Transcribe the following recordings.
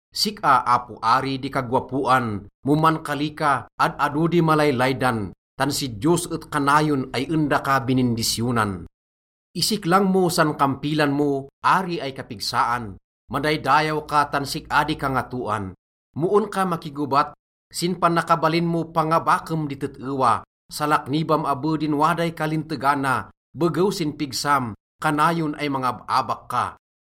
Sik-a, apo ari, di kagowapoan, mo mankali ka, ad-ado di malaylaydan, tan si Diyos et kanayon ay en daka binindisyonan. Isiklang mo san kampilan mo, ari ay kapigsaan, madaydayaw ka tan sik-a di kangatoan. Mo en ka makigobat, sin panakabalin mo pangabakem di tet-ewa, salaknibam abe din waday kalintegana. Begew sin pigsam, kanayon ay mangab-abak ka!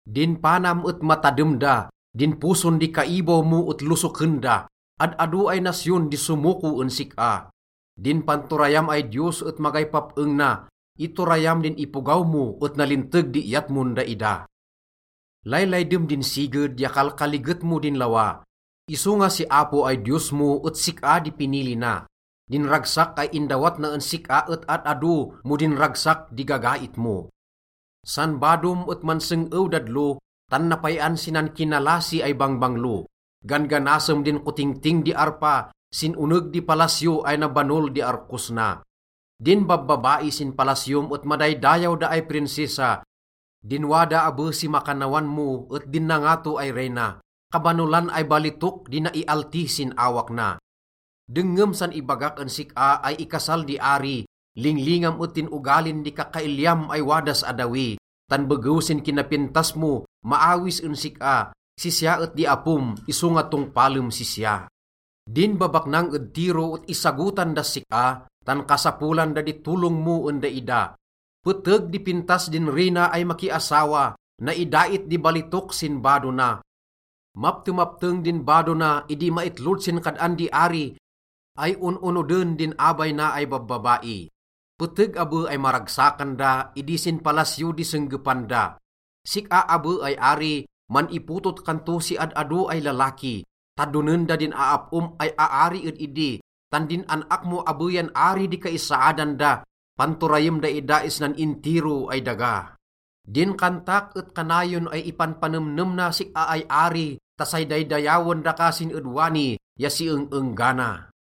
Din panam et matadem da, din poson di kaibaw mo et losoken da, ad-ado ay nasyon di somoko en sik-a. Din panturayam ay Diyos et magay pap-eng na. Iturayam din ipogaw mo et nalinteg di iyat mon daida. Laylaydem din siged ya kalkaliget mo din lawa. Isonga si Apo ay Diyos mo et sik-a di pinili na. Din ragsak ay indawat na en sik-a et ad-ado mo din ragsak di gagait mo. San badom et manseng-ew dadlo, tan napay-an si nankinalasi ay bangbanglo. Gan-ganasem din kotingting di arpa sin oneg di palasyo ay nabanol di arkos na. Din babbabai sin palasyom et madaydayaw da ay prinsesa. Din wada abe si makannawan mo et din nangato ay reyna. Kabanolan ay balitok di naialti sin awak na. Dengngem san ibagak en sik-a ay ikasal di ari. Linglingam et din ogalin di kakailiam ay wadas addawi, tan begew sin kinapintas mo maawis en sik-a. Sisya et di apom, isonga tongpalem sisya. Din babaknang ed Tiro et isagotan das sik-a, tan kasapolan da di tolong mo en daida. Peteg di pintas din reyna ay makiasawa, naidait di balitok sin bado na. Maptemapteng din bado na idi maitlod sin kad-an di ari ay on-onoden din abay na ay babbabai. Peteg abe ay maragsakan da idi sin palasyo di senggepan da. Sik-a abe ay ari, man-ipotot kan to si ad-ado ay lalaki. Tadonen da din aap-om ay aari ed idi, tan din an-ak mo abe yan ari di kaisaadan da, panturayem daida isnan intiro ay daga. Din kantak et kanayon ay ipanpanemnem na sik-a ay ari ta say daydayawen daka sin ed wani ya si eng-enggana.